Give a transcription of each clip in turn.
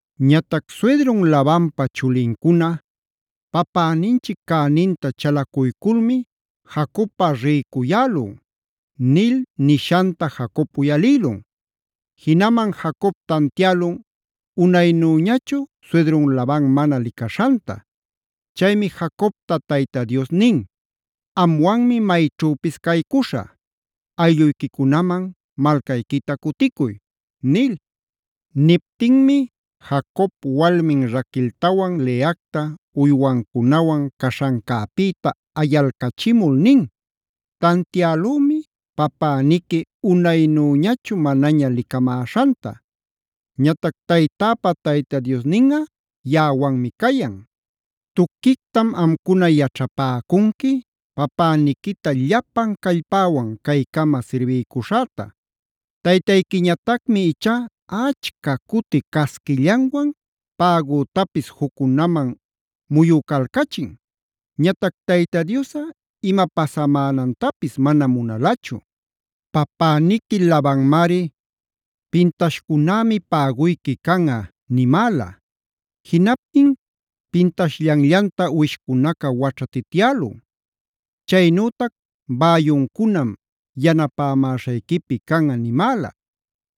Ñatac suydrun Labanpa chulincuna: “Papäninchic cäninta chalacuyculmi Jacobꞌa rïcuyälun” nil nishanta Jacob uyalïlun. Jinaman Jacob tantiälun unaynüñachu suydrun Laban mana licaśhanta. Chaymi Jacobta Tayta Dios nin: “Amwanmi mayćhüpis caycuśhä; aylluyquicunaman malcayquita cuticuy” nil. Niptinmi Jacob walmin Raqueltawan Leacta uywancunawan caśhancäpïta ayalcachimul nin: “Tantiälümi, papäniqui unaynüñachu manaña licamäśhanta. Ñatac taytäpa Tayta Diosninꞌa yaꞌawanmi cayan. Tuquictam amcuna yaćhapäcunqui papäniquita llapan callpäwan caycama sirbiycuśhäta. Taytayquiñatacmi ichá achca cuti casquillanwan pägütapis juccunaman muyucalcachin. Ñatac Tayta Diosꞌa ima pasamänantapis manam munalachu. Papäniqui Labanmari: ‘Pintashcunämi päguyqui canꞌa’ nimäla. Jinaptin pintashllanllantam uwishcunaca waćhatityälun. Chaynütac ‘bäyuncunam yanapämaśhayquipi canꞌa’ nimäla.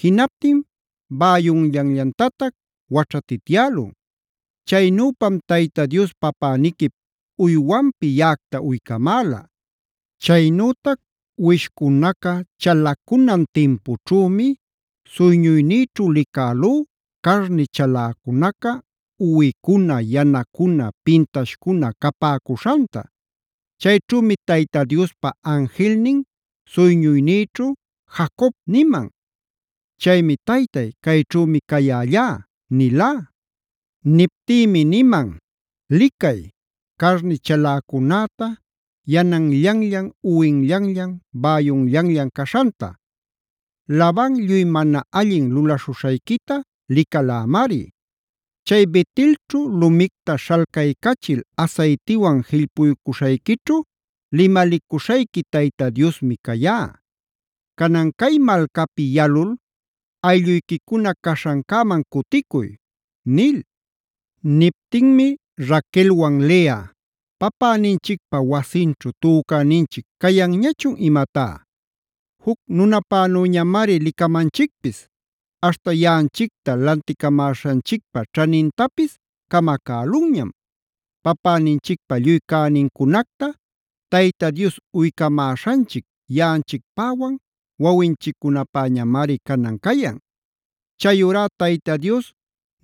Jinaptin bäyunllanllantatac waćhatityälun. Chaynüpam Tayta Dios papäniquip uywanpi yaꞌacta uycamäla. “Chaynütac uwishcunaca chalacunan timpućhümi, suyñuynïćhu licälú carni chaläcunaca uwicuna, yanacuna, pintashcuna capäcuśhanta. Chayćhümi Tayta Diospa anjilnin suyñuynïćhu: ‘Jacob’ niman. Chaymi: ‘Taytay, cayćhümi cayällá’ nilá. Niptïmi niman: ‘Licay carni chaläcunäta, yananllanllan, uwinllanllan, bäyunllanllan caśhanta. Laban lluy mana allin lulaśhuśhayquita licalämari. Chay Bet-elćhu lumicta śhalcaycachil asaytiwan jillpuycuśhayquićhu limalicuśhayqui Tayta Diosmi cayá.a Canan cay malcapi yalul, aylluyquicuna caśhancäman cuticuy’” nil. Niptinmi Raquelwan Lea: “¿Papäninchicpa wasinćhu tücäninchic cayanñachun imatá? Juc nunapänüñamari licamanchicpis, aśhta yaꞌanchicta lanticamäśhanchicpa ćhanintapis camacälunñam. Papäninchicpa lluy cänincunacta Tayta Dios uycamäśhanchic yaꞌanchicpäwan wawinchiccunapäñamari canan cayan. Chayurá Tayta Dios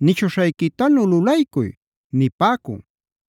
nishuśhayquitanu lulaycuy” nipäcun.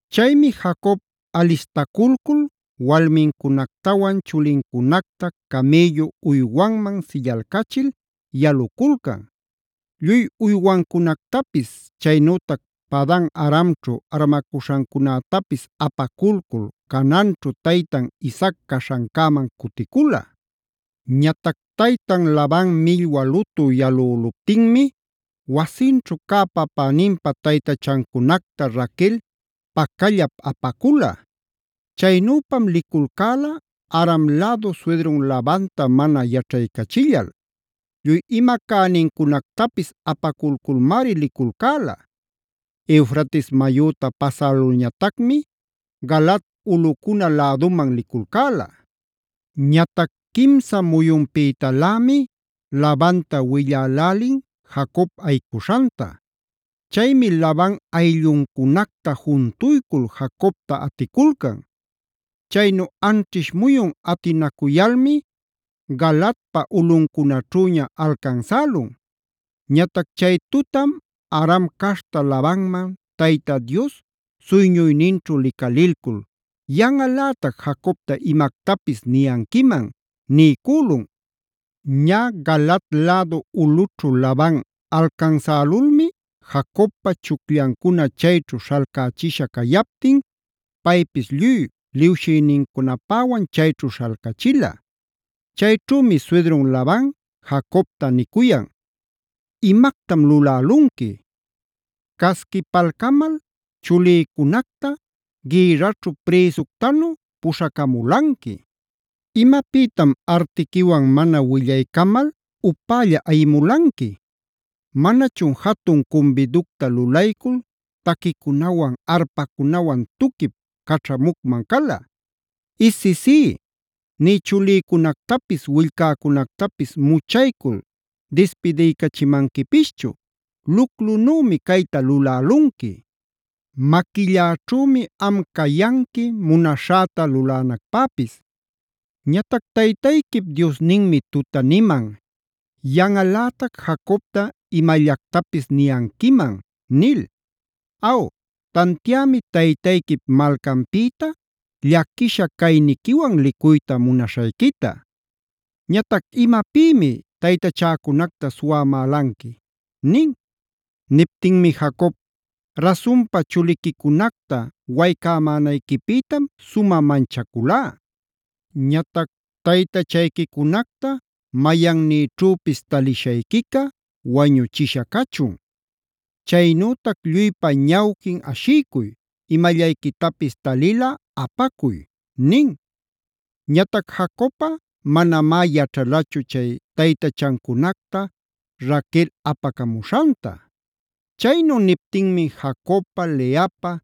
Chaymi Jacob alistaculcul walmincunactawan chulincunacta camïllu uywanman sillalcachil yaluculcan. Lluy uywancunactapis, chaynütac Padan-aramćhu armacuśhancunätapis apaculcul Canaanćhu taytan Isaac caśhancäman cuticula. Ñatac taytan Laban millwa lutü yalüluptinmi wasinćhu cä papäninpa taytachancunacta Raquel pacallap apacula. Chaynüpam liculcäla Aram lädu suydrun Labanta mana yaćhaycachillal. Lluy ima cänincunactapis apaculculmari liculcäla. Eufrates mayüta pasälulñatacmi Galaad ulꞌucuna läduman liculcäla. Ñatac quimsa muyunpïtalämi Labanta willälälin Jacob ayicuśhanta. Chaymi Laban aylluncunacta juntuycul Jacobta aticulcan. Chaynu anćhish muyun atinacuyalmi Galaadpa ulꞌuncunaćhüña alcansälun. Ñatac chay tutam Aram caśhta Labanman Tayta Dios suyñuyninćhu licalilcul: “Yanꞌalätac Jacobta imactapis niyanquiman” niycülun. Ñä Galaad lädu ulꞌućhu Laban alcansälulmi Jacobpa chucllancuna chayćhu śhalcächisha cayaptin, paypis lluy liwshïnincunapäwan chayćhu śhalcachila. Chayćhümi suydrun Laban Jacobta nicuyan: “¡Imactam lulälunqui! ¡Casquipalcamal chulïcunacta gïrraćhu prïsuctanu puśhacamulanqui! ¿Imapïtam artiquiwan mana willaycamal upälla ayimulanqui? ¿Manachun jatun cumbiducta lulaycul taquicunawan, arpacunawan tuquip caćhamucman cala? Isisí, nï chulïcunactapis willcäcunactapis muchacuycul dispidiycachimanquipischu. ¡Luclunümi cayta lulälunqui! Maquilläćhümi am cayanqui munaśhäta lulänacpäpis. Ñatac taytayquip Diosninmi tuta niman: ‘Yanꞌalätac Jacobta imallactapis niyanquiman’ nil. Aw, tantiämi taytayquip malcanpïta llaquisha cayniquiwan licuyta munaśhayquita. Ñatac ¿imapïmi taytachäcunacta suwamälanqui?” nin. Niptinmi Jacob: “Rasunpa, chuliquicunacta waycämanayquipïtam sumä manchaculá. Ñatac taytachayquicunacta mayannïćhüpis taliśhayquica wañuchishä cachun. Chaynütac lluypa ñawquin ashiycuy, imallayquitapis talilꞌa apacuy” nin. Ñatac Jacobꞌa manamá yaćhalachu chay taytachacunacta Raquel apacamuśhanta. Chaynu niptinmi Jacobpa, Leapa,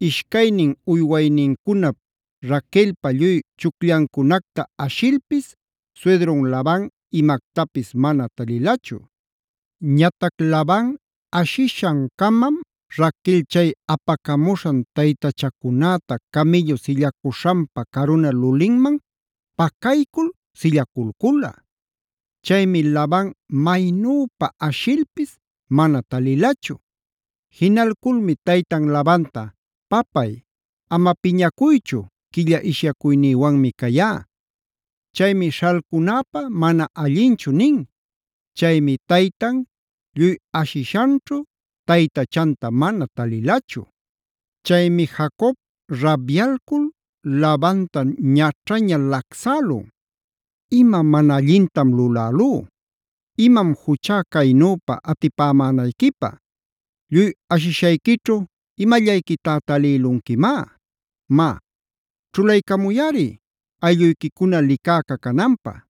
ishcaynin uywaynincunap, Raquelpa lluy chucllancunacta ashilpis suydrun Laban imactapis mana talilachu. Ñatac Laban ashishan-camam Raquel chay apacamuśhan taytachacunäta camïllu sillacuśhanpä caruna lulinman pacaycul sillaculcula. Chaymi Laban maynüpa ashilpis mana talilachu. Jinalculmi taytan Labanta: “Papay ama piñacuychu, quilla ishyacuynïwanmi cayá. Chaymi śhalcunäpä mana allinchu” nin. Chaymi taytan lluy ashishanćhu taytachanta mana talilachu. Chaymi Jacob rabyalcul Labanta ñaćhaña lacsälun: “¡Ima mana allintam lulälú! ¡Imam juchá caynüpa atipämänayquipä! Lluy ashishayquićhu, ¿imallayquitá talïlunquimá? Má, ćhulaycamuyꞌari aylluyquicuna licäca cananpä.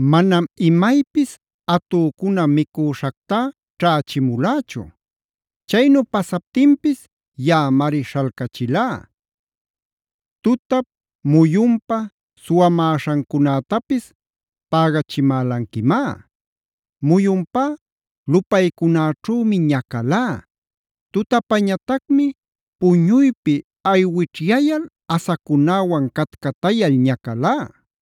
Manam imaypis atücuna micüśhactá ćhächimulächu; chaynu pasaptinpis yaꞌamari śhalcachilá. Tutap muyunpa suwamäśhancunätapis pägachimälanquimá. Muyunpá lupaycunäćhümi ñacalá; tutapañatacmi puñuypi aywićhyayal asacunäwan catcatayal ñacalá.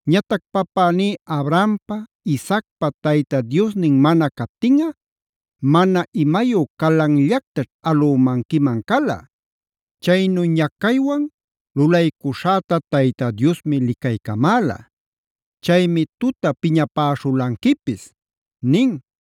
Ñatac papäní Abrahampa, Isaacpa Tayta Diosnin mana captinꞌa mana imayu calanllactaćh alümanquiman cala. Chaynu ñacaywan lulaycuśhäta Tayta Diosmi licaycamäla. Chaymi tuta piñapäśhulanquipis” nin.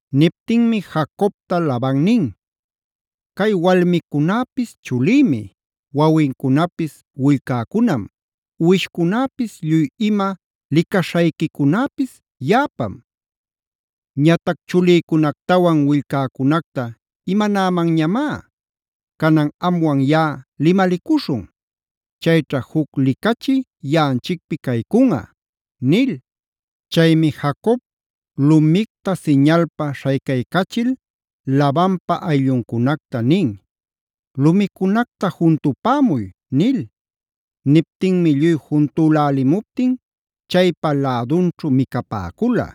Niptinmi Jacobta Laban nin: “Cay walmicunäpis chulïmi, wawincunapis willcäcunam, uwishcunäpis, lluy ima licaśhayquicunäpis yaꞌapam. Ñatac ¿chulïcunactawan willcäcunacta imanämanñamá? Canan amwan yaꞌa limalicuśhun. Chayćha juc licachi yaꞌanchicpi caycunꞌa” nil. Chaymi Jacob lumicta siñalpa śhaycaycachil Labanpa aylluncunacta nin: “Lumicunacta juntupämuy” nil. Niptinmi lluy juntülälimuptin chaypa lädunćhu micapäcula.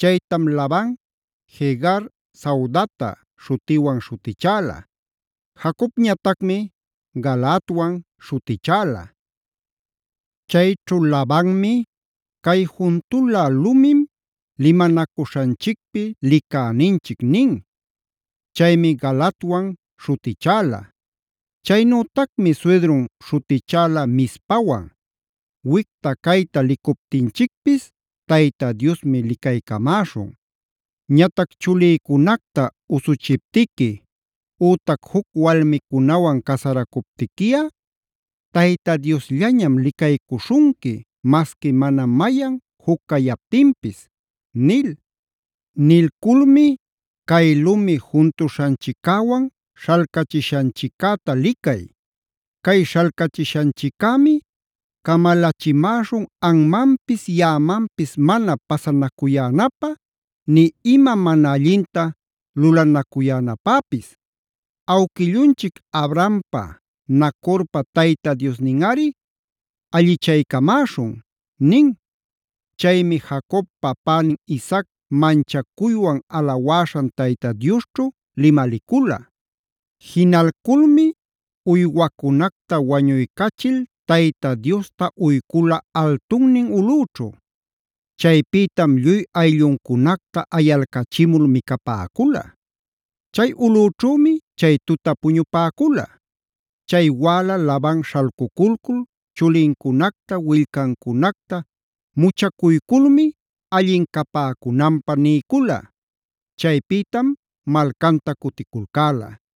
Chaytam Laban “Jegar Sahudata” śhutiwan śhutichäla. Jacobñatacmi “Galaadwan” śhutichäla. Chayćhu Labanmi: “Cay juntula lumim limanacuśhanchicpi licäninchic” nin. Chaymi Galaadwan śhutichäla. Chaynütacmi suydrun śhutichäla Mizpawan: “Wicta cayta licuptinchicpis Tayta Diosmi licaycamäśhun. Ñatac chulïcunacta usuchiptiqui, ütac juc walmicunawan casaracuptiquiꞌa Tayta Diosllañam licaycuśhunqui masqui mana mayan juc cayaptinpis” nil. Nilculmi: “Cay lumi juntuśhanchiccäwan śhalcachishanchiccäta licay. Cay śhalcachishanchiccämi camalachimäśhun anmanpis yaꞌamanpis mana pasanacuyänapä, nï ima mana allinta lulanacuyänapäpis. ¡Awquillunchic Abrahampa Nacorpa Tayta Diosninꞌari allichaycamäśhun!” nin. Chaymi Jacob papänin Isaac manchacuywan alawäśhan Tayta Diosćhu limalicula. Jinalculmi uywacunacta wañuycachil Tayta Diosta uycula altunnin ulꞌüćhu. Chaypïtam lluy aylluncunacta ayalcachimul micapäcula. Chay ulꞌüćhümi chay tuta puñupäcula. Chay wäla Laban śhalcuculcul chulincunacta willcancunacta muchacuyculmi allin capäcunanpä niycula. Chaypïtam malcanta cuticulcäla.